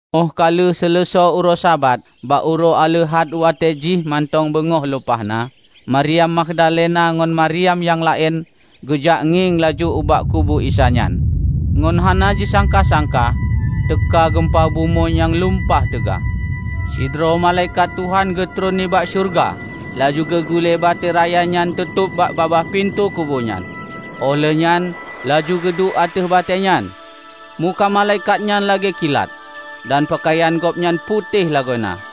Óh ka lheueh seuleusoe uroe Sabat, bak uroe aleuhat watée jih mantong beungoh lumpah na, Mariam Magdalena ngon Mariam nyang laén geujak ngieng laju ubak kubu Isa nyan. Ngon hana jisangka-sangka teuka geumpa bumoe nyang lumpah teuga. Sidroe malaikat Tuhan geutron nibak syeuruga laju geugule batée raya nyang teutôb bak babah pintoe kubu nyan, óh lheueh nyan laju geuduek ateueh batée nyan. Muka malaikat nyan lagée kilat, dan peukayan gobnyan putéh lagoena.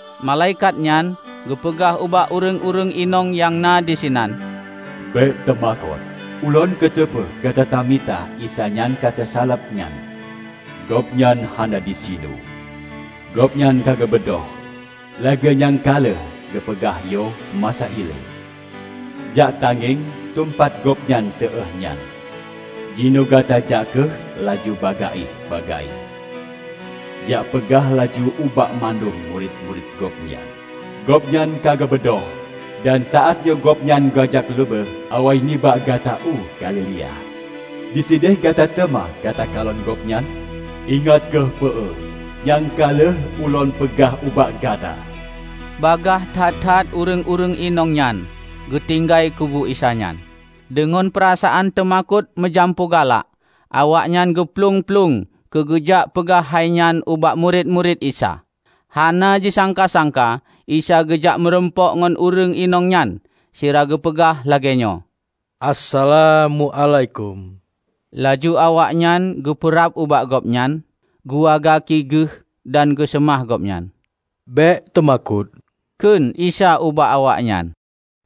Malaikat nyan geupeugah ubak ureuëng-ureuëng inong nyang na disinan, "Bék teumakot! Ulôn kuteupeu gata tamita Isa nyang ka teusaleb nyan. Gobnyan hana disinoe. Gobnyan ka geubeudôh lagée nyang ka lheueh geupeugah yoh masa ilée. Jak tangieng teumpat Gobnyan teuéh nyan. Jinoe gata jak kheueh laju bagaih-bagaih, jak peugah laju ubak mandum murit-murit Gobnyan, 'Gobnyan ka geubeudôh, dan saát nyoe Gobnyan geujak leubeh awai nibak gata u Galilea. Disideh gata teuma gata kalon Gobnyan!' Ingat kheueh peue nyang ka lheueh ulôn peugah ubak gata." Bagaih that-that ureuëng-ureuëng inong nyan geutinggai kubu Isa nyan. Deungon peurasaan teumakot meujampu galak, awaknyan geuplueng-plueng keu geujak peugah hai nyan ubak murit-murit Isa. Hana jisangka-sangka Isa geujak meurumpok ngon ureuëng inong nyan sira geupeugah lagée nyoe, "Assalam muálaikum!" Laju awaknyan geupeurab ubak Gobnyan, geuwa gaki Geuh dan geuseumah Gobnyan. "Bék teumakot," kheun Isa ubak awaknyan,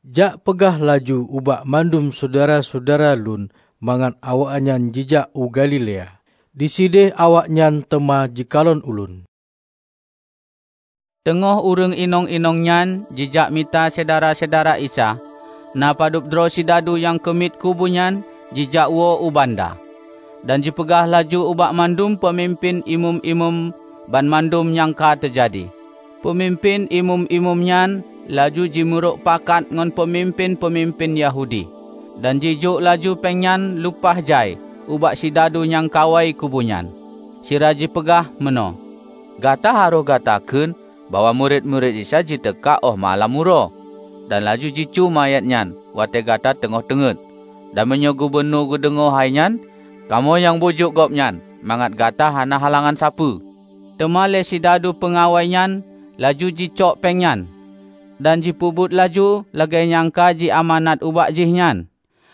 "Jak peugah laju ubak mandum syedara-syedara Lôn mangat awaknyan jijak u Galilea; disideh awaknyan teuma jikalon Ulôn." Teungoh ureuëng inong-inong nyan jijak mita syedara-syedara Isa, na padub droe sidadu nyang keumiet kubu nyan jijak woe u banda, dan jipeugah laju ubak mandum peumimpén Imeum-imeum banmandum nyang ka teujadi. Peumimpén Imeum-imeum nyan laju jimeurok pakat ngon peumimpén-peumimpén Yahudi, dan jijok laju péng nyang lupah jai ubak sidadu nyang kawai kubu nyan, sira jipeugah meunoe, "Gata harôh gata kheun bahwa murit-murit Isa jiteuka óh malam uroe, dan laju jicue manyét nyan watée gata teungoh teungét. Dan meunyoe gubunur geudeungoe hai nyan, kamoe nyang bujuk gobnyan mangat gata hana halangan sapeue." Teuma lé sidadu peungawai nyan laju jicok péng nyan, dan jipeubuet laju lagée nyang ka ji amanat ubak jihnyan.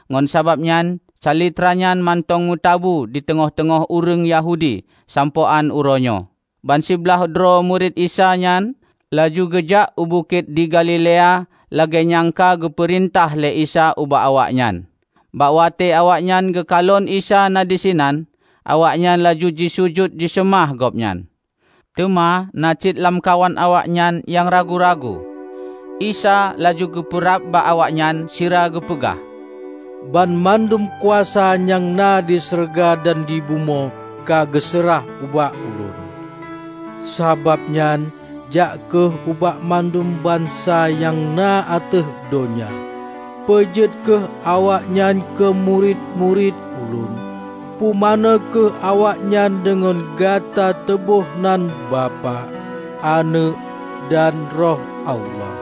Ngon sabab nyan calitra nyan mantong meutabu di teungoh-teungoh ureuëng Yahudi sampoe án uroe nyoe. Ban siblaih droe murit Isa nyan laju geujak u bukét di Galilea lagée nyang ka geupeurintah lé Isa ubak awaknyan. Bak watée awaknyan geukalon Isa na disinan, awaknyan laju jisujut jiseumah Gobnyan. Teuma na cit lamkawan awaknyan nyang ragu-ragu. Isa laju geupeurab bak awaknyan sira geupeugah, "Banmandum kuasa nyang na di syeuruga dan di bumoe ka geuseurah ubak Ulôn. Sabab nyan jak kheueh ubak mandum bansa nyang na ateueh donya, peujeuet kheueh awaknyan keumurit-murit Ulôn. Pumanö kheueh awaknyan deungon gata teuôh nan Bapak, Aneuëk, dan Roh Allah.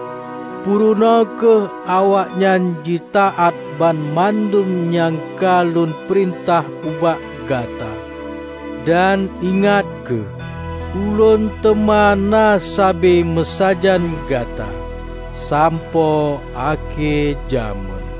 Purunoe kheueh awaknyan jitaát banmandum nyang ka Lôn peurintah ubak gata. Dan ingat kheueh Ulôn teuma na sabe meusajan gata sampoe akhé jamén."